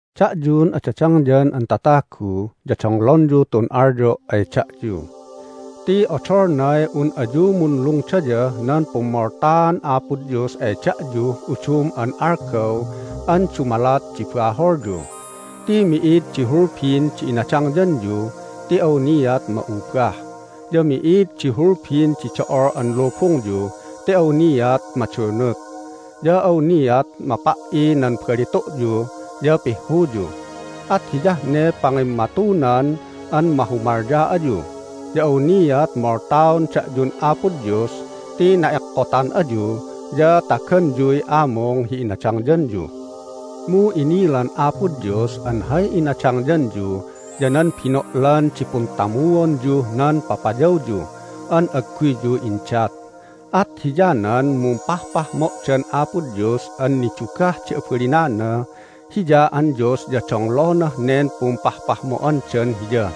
Da'yun adadangyan an tatagu ya donglonyu tun alyo' ay da'yu. Ti odolnay un ayu munlungdayah nan pummoltaan Apo Dios ay da'yuh udum an algaw an dumalat di baholyu. Ti mi'id di hulbin di inadangyanyu ti awniat ma'ubah, ya mi'id di hulbin di do'ol an lubungyu ti awniat madunut. Ya awniat mapa"i nan balitu'yu ya pihhuyu. At hiyah ne pangimmatunan an mahumalya ayu. Ya awniat moltaon da'yun Apo Dios ti na'ekkotan ayu ya taganyuy amung hi inadangyanyu. Mu inilan Apo Dios an hay inadangyanyu ya nan bino'lan di puntamuonyuh nan papayawyu an agguyyu indat. At hiyanan mumpahpahmo'dan Apo Dios an nidugah di abalinana. Hiya an Dios ya donglonah nen pumpahpahmo'andan Hiya!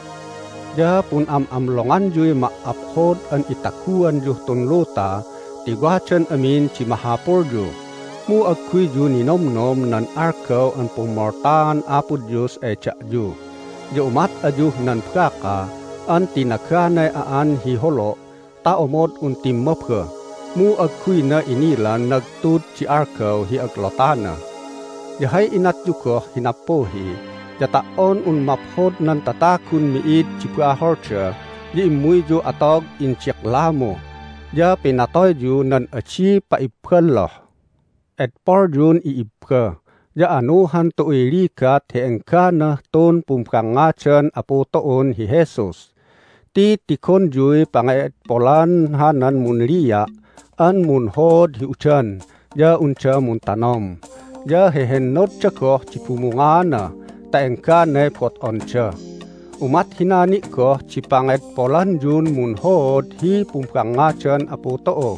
Ya pun'am'amlonganyuy ma"aphod an itaguanyuh tun luta ti wadan amin di mahapulyu, mu agguyyu ninomnom nan algaw an pummoltaan Apo Dios ay da'yu. Ya umat ayuh nan baka an tinaganay a'an hi holo' ta omod un timmaba, mu agguyna inilan nagtud di algaw hi aglotana. Ya hay inatyu goh hi nappuhi ya ta"on un maphod nan tatagun mi'id di baholda ya immuyyu atog indiklamu, ya pinatoyyu nan adi pa'ibballoh. Edpolyun i'ibba, ya anuhan tu'uy ligat hi engganah tun pumbangngadan Apu tu'un hi Jesus. Ti tigonyuy pange'edpolan hanan munlia' an munhood hi udan ya unda muntanom, ya hehennodda goh di bumungaana ta engganay bot'onda. Umat hina ni' goh di pangedpolanyun munhood hi pumbangngadan Apu tu'u,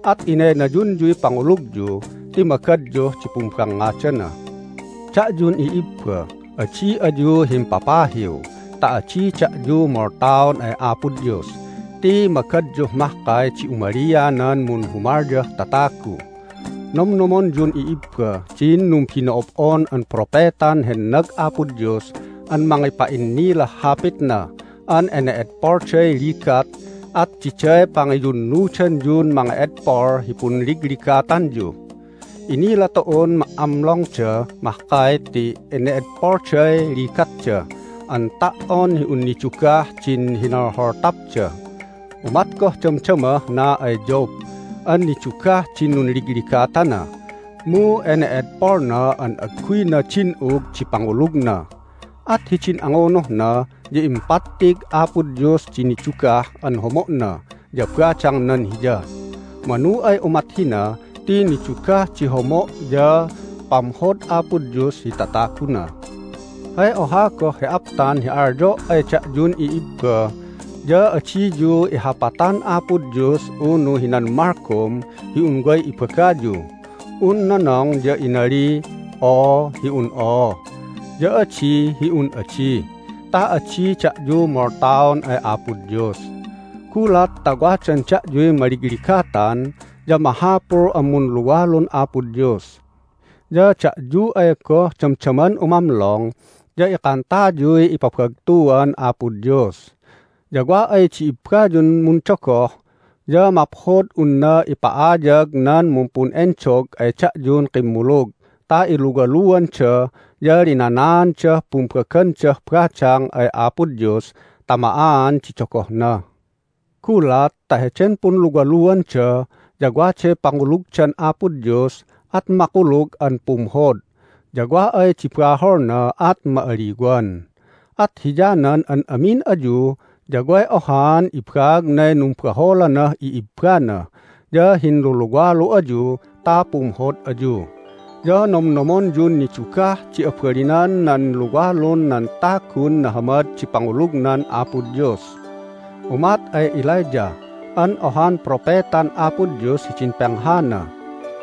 at inaynayunyuy pangulugyu ti magadyuh di pumbangngadana. Da'yun i'ibba, adi ayu himpapahiw ta adi da'yu moltaon ay Apo Dios ti magadyuh mahkay di umalianan munhumalyah tatagu. Nomnomonyun i'ibba din numbino'ob'on an propetan hennag Apo Dios an mangipa'innilah Hapitna an ene'edpolday ligat, at diday pangiyunnudanyun mange'edpol hi punligligatanyu. Inila tu'un ma"amlongda mahkay ti ene'edpolday ligatda an ta"on hi un nidugah din hinolholtapda. Umat goh damdamah na ay Job an nidugah din nunligligatana, mu ene'edpolna an agguyna din'ug di pangulugna. At hidin angunuhna ya impattig Apo Dios di nidugah an homo'na ya badangnan hiya. Manu ay umat hina ti nidugah di homo' ya pamhod Apo Dios hi tataguna. Hay oha goh hi aptan hi alyo' ay da'yun i'ibba ya adiyu ihapatan Apo Dios unu hinan malgom hi un way ibagayu. Un nonong ya inaliy, "Oo," hi un oo, ya "Adi," hi un adi, ta adi da'yu moltaon ay Apo Dios. Gulat ta wadan da'yuy maligligatan ya mahapul an munluwalun Apo Dios. Ya da'yu ay goh damdaman umamlong ya ikantayuy ipabagtuan Apo Dios. Ya wa ay di ibbayun mundogoh ya maphod hi unna ipa'ayag nan mumpun'endog ay da'yun kimmulug ta iluwaluanda ya linanaandah pumbagandah badang ay Apo Dios ta ma'aan di dogohna. Gulat ta heden punluwaluanda ya waday pangulugdan Apo Dios at makulug an pumhod, ya wa ay di baholna at ma'aliwan. At hiyanan an amin ayu ya way ohaan ibaagnay numbaholanah i'ibbana ya hinluluwalu ayu ta pumhod ayu. Ya nomnomonyun nidugah di abalinan nan luwalun nan tagun nahamad di pangulugnan Apo Dios. Umat ay Elijah an ohan propetan Apo Dios hidin penghana.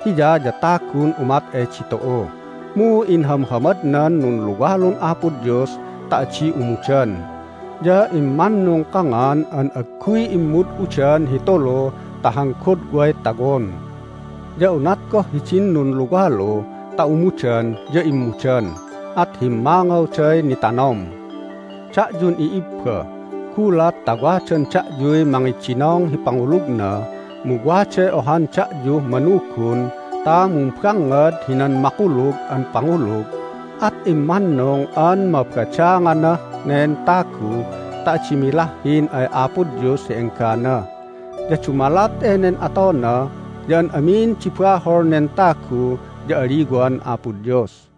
Hiya ya tagun umat ay ditu'u, mu inhamhamadnan nunluwalun Apo Dios ta adi umudan, ya immannung kangan an agguy immud'udan hi tulu ta han godway tawon. Ya unat goh hidin nunluwalu ta umudan ya immudan, at himmangawday nitanom. Da'yun i'ibba, gulat ta wadan da'yuy mangidinong hi pangulugna, mu waday ohan da'yuh manugun ta mumbangngad hinan makulug an pangulug, at immannung an mabadanganah nen tagu ta adi milahhin ay Apo Dios hi enggana. Ya dumalat enen atona ya an amin di bahol nen tagu ya aliwan Apo Dios.